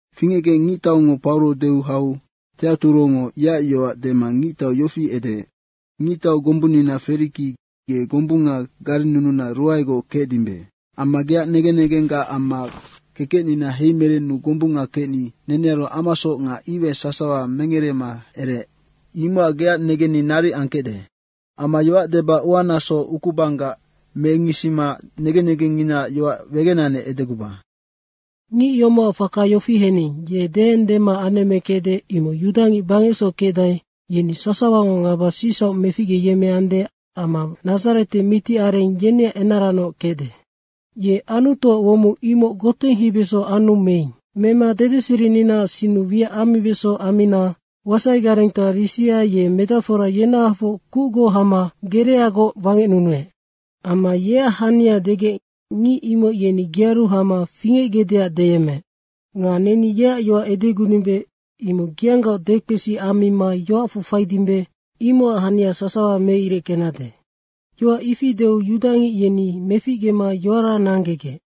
Fingecgec ngictaungo Pauro deu hau Teaturongo yeac yoac dema ngictau yofi edeec, “Ngictau gombunnina Feriki, ge gombunga garennununa ruaegoc kecdimbe. Amma geac negen negenggac amma kekecnina heimerenu gombunga kecni nenearu amasoc nga iwai sasawa ngereema ereec. Imocac geac negenni naric angkecde. Amma yoac deba uanaso ukubanggac mengisima negen negenninaac yoac wegenanec edeguba. Ngic yomocac faka yofi hening, ye deendema anemmekecde, imoc yudangic bangecsoc kecdae, yeni sasawango ngaba sicsauc meficgeyemmeande amma Nadzarete mitiareng yeneac enaranoc kecde. Ye Anutuac womong imoc goteng heibeso anu meing. [Mema dedeserininaac sinnu wiac ammibeso ammina wasaigarengtoa Risia ye medacfora yenahafoc kucgoc hama gereagoc wangecnunuec. Amma yeac hania degec, ngic imoc yeni gearu hama fingecgecdeac deyemmeec.] Nga neni yeac yoac edegudimbe, imoc geanggaoc dekpesi ammima yoacfu faidimbe, imocac hania sasawa meireckenade.” Yoac ifi deu yudangic yeni meficgema yoara nanggegec.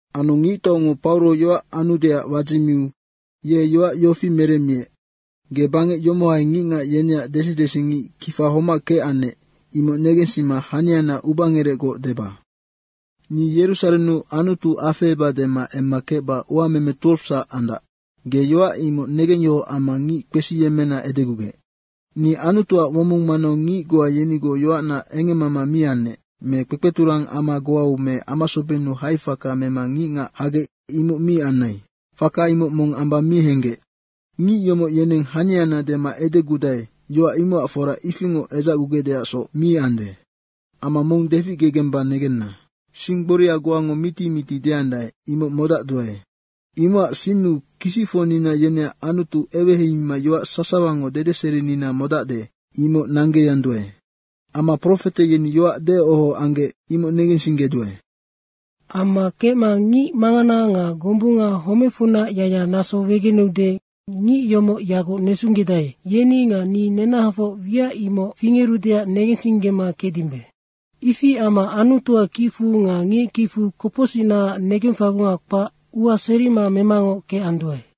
Anu ngictaungo Pauro yoac anudeac wadzimiu ye yoac yofi meremmiec, “Ge bangec yomohai ngicngac yeneac desidesingic kifa homac kecannec, imoc negensima haniana ubangerecgoc deba. Ni Yerusarennu Anutu afeheba dema emma kecba uameme 12sac andac, ge yoac imoc negengyohoc amma ngic kpesiyemmena edegugec. Ni Anutuac womong manau ngic goa yenigoc yoacna engemmama mi anec. Me kpekpeturang ama goau me amasobennu haifaka mema ngicngac hagec, imoc mi anai. Faka imoc mong amba mi henggec. Ngic yomoc yeneng haniana dema edegudae, yoac imocac fora ifingoc edzacgugecdeacsoc mi ande. Amma mong deficgegemba negenna: Sing gboria goango miti miti deandae, imoc modacduae. Imocac sinnu kisicfocnina yeneac Anutu eweheimima yoac sasawango dedeserinina modacde, imoc nanggeanduae. Amma profete yeni yoac deoho anggec, imoc negensinggeduae. Amma kecma ngic mangana nga gombunga homecfunac yacyac naso wegeneude, ngic yomoc yaguc nesunggedae, yeni nga ni nenahafoc wiac imoc fingerudeac negensinggema kecdimbe. Ifi amma Anutuac kicfu nga ngic kicfu kopocsicnaac negengfagunga kpac ua serima memangoc kecanduae.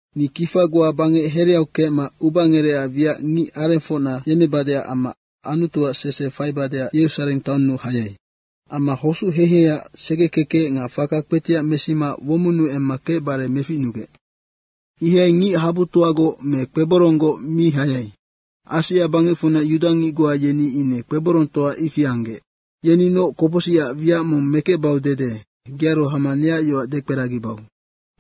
Ni kifa goa bangec hereau kecma ubangerecac wiac ngic arengfocna yemmebadeac amma Anutuac sese faibadeac Yerusareng taonnu hayai. Amma hosuc heiheiac segekekec nga faka kpetiac mesima womonnu emma kecbare meficnugec. Ihai ngic habutoagoc me kpeboronggoc mi hayai. Asia bangecfunac yudangic goa, yeni ine kpeborongtoa ifi anggec. Yeninoc kopocsicac wiac mong mekecbau dede gearu hama neac yoac dekperagibau.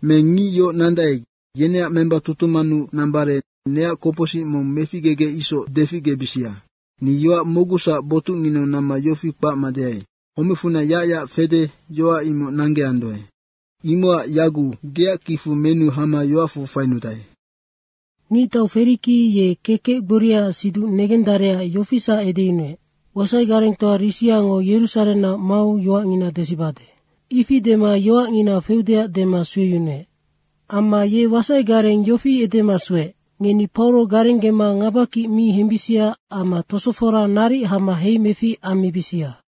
Me ngic yoc nandae, yeneac memba tutumannu nambare neac kopocsic mong meficgegec isoc deficgebisia. Ni yoac mocgusac botucnginau namma yofi kpacma deai, ‘Homecfunac yacyac fede, yoac imoc nanggeanduae.’ Imocac yaguc geac kicfu menu hama yoacfu fainudae.” Ngictau Feriki ye kekec gboriaac siduc negendarecac yofisac edeyunuec, “Wasai garengtoa Risiango Yerusarennac mau yoacngina desibade.” Ifi dema yoacngina feudeac dema sueyunuec. Amma ye wasaigareng yofi edema sueec, “Ngeni Pauro garenggema ngabakic mi hembisia amma tosofora naric hama heimefic ammibisia.”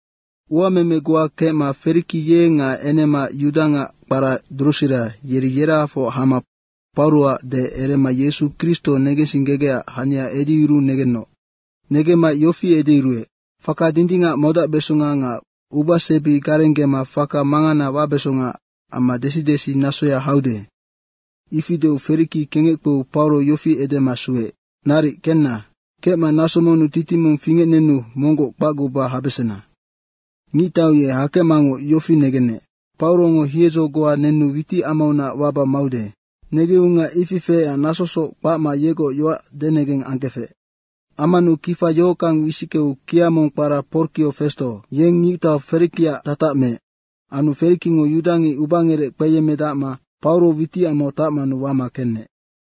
Uameme goa kecma Feriki ye nga enema, yudangac kpara Drusira, yeri yerahafoc hama Pauroac deec erema Yesu Kristo negensinggegecac hania edeyuruu negenoc. Negemmaec yofi edeyuruec, “Faka dindingac modacbesonga nga ubasebi garenggema faka mangana wabesonga amma desidesi nasoya haude.” Ifi deu Feriki kengec kpeu Pauro yofi edema sueec, “Naric kenna, kecma naso monnu titing mong fingecnenu monggoc kpacguba habesena.” Ngictau ye hakecmangoc yofi negenec: Paurongo hiedzo goa nenu witicamaunac waba maude. Negeunga ifi feecac nasosoc kpacma yegoc yoac denegeng angkefec. Ammanu kifa yohockang wisickeu kia mong kpara Porkio Festo, yeng ngictau Ferikiac tatac meec. Anu Ferikingo yudangic ubangerec kpeyemmedacma Pauro witicamau tacmanu wama kenec.